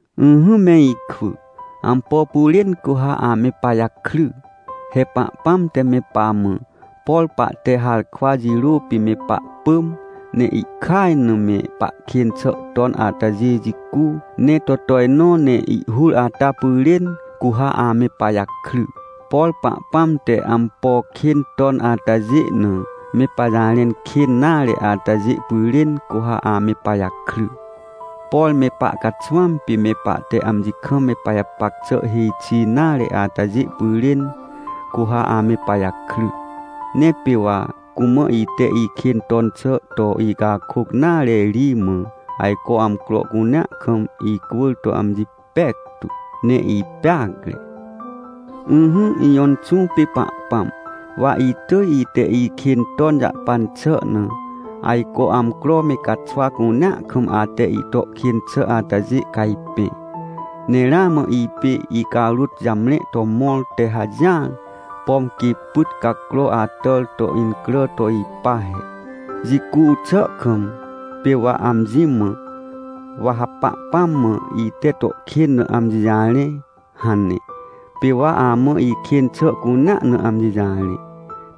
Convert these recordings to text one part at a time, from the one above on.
Ỹhỹ me ikwỳ! Ampo pyrên cu ha ame pajakry? He Pahpãm te me pamã, por pahte harkwa jirô pê me pahpỳm, ne ihkaj na me pahkên xà ton atajê jicu, ne to tojnõ ne ihhur ata pyrên, cu ha ame pajakry. Por Pahpãm te ampo kên ton atajê na me pajarẽn kên nare atajê pyrên, cu ha ame pajakry. Por me pahcaxwãm pê me pahte amji kam me pajapac xà hêj xi nare atajê pyrên, cu ha ame pajakry. Ne pê wa cumã ite ikên ton xà to icakôc nare ri mã, ajco amcro cunea kam icwỳr to amji pectu, ne ipeacre. Ỹhỹ, ijõ Inxũ pê Pahpãm, wa itỳj ite ikên ton jahpan xà na, ajco amcro me caxwa cunea kam ate ito kên xà atajê cajpẽ, ne ramã ipê icarôt jamre to mõr te hajỹar, pom quê pyt cacro atàr to incrà to ipa he. Jicu xà kam, pê wa amji mã: “Wa ha Pahpãm mã ite to kên na amji jarẽ” hane. Pê wa amã ikên xà cunea na amji jarẽ.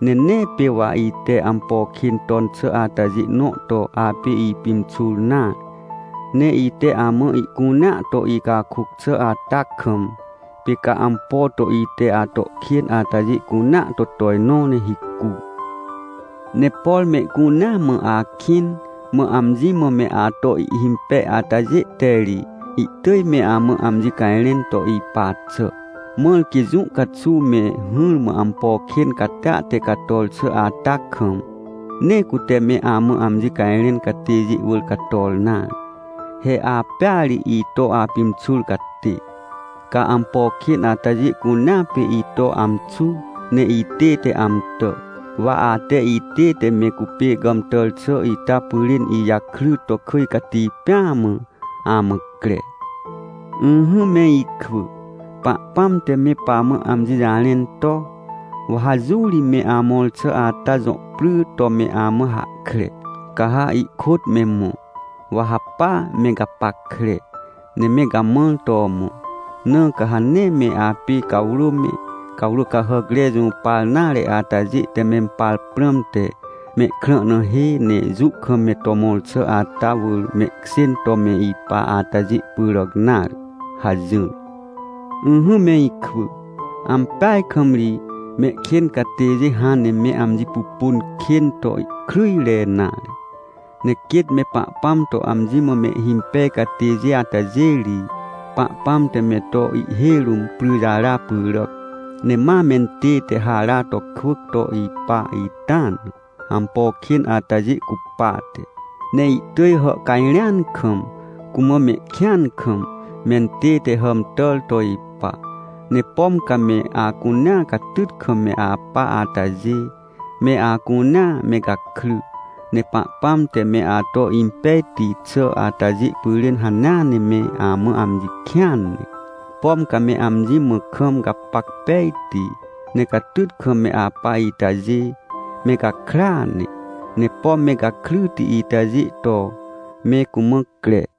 Ne nee pê wa ite ampo kên ton xà atajê nõ to apê ipimxur nare. Ne ite amã ihcunea to icakôc xà ata kam, pê ca ampo to ite ato kên atajê cunea to tojnõ, ne hicu. Ne por mehcunea mã akĩn, mã amji mã me ato ihhimpej atajê te ri, ihtỳj me amã amji cajrẽn to ipa xà. Mãr quê jũ caxuw me hỹrmã ampo kên catia te cator xà ata kam, nee cute me amã amji cajrẽn catêjê wỳr cator nare. He apêa ri ito apimxur catê. Ca ampo kên atajê cunea pê ito amxu ne itête amtà. Wa ate itête me cupê gàmtàr xà ita pyrên ijakry to kỳj cati pêa mã, amã cre. Ỹhỹ me ikwỳ, Pahpãm te me pamã amji jarẽn to: “Wa ha jũ ri me amõr xà ata jõ pry to me amã hahkre, ca ha ihkôt me mõ. Wa ha pa me gapackre, ne me gamãr to mõ. Na ca ha nee me apê cawrô me, cawrô cahàcre jũpar nare atajê te mempar prãmte, mehkrã na hê, ne jũ kam me to mõr xà ata wỳr mehkjên to me ipa atajê pyràc nare” hajỹr. Ỹhỹ me ikwỳ, ampeaj kam ri, mehkên catêjê hãn ne me amji pupun kên to ihkryjre nare. Ne quêt me Pahpãm to amji mã mehhimpej catêjê atajê ri, Pahpãm te me to ihhêj rũm pryjara pyràc, ne ma mentête hara to kwỳc to ipa ita na, ampo kên atajê cupate. Ne ihtỳj hàhcajrẽan kam, cumã mehkĩan kam, mentête hàmtàr to ipa. Ne pom ca me acunea catyt kam me apa atajê, me acunea me gakry! Ne Pahpãm te me ato impejti xà atajê pyrên hanea ne me amã amji kĩan ne! Pom ca me amji mã kam gapac pejti, ne catyt kam me apa itajê, me gakrya ne, ne pom me gakryti itajê to, me cumã cre!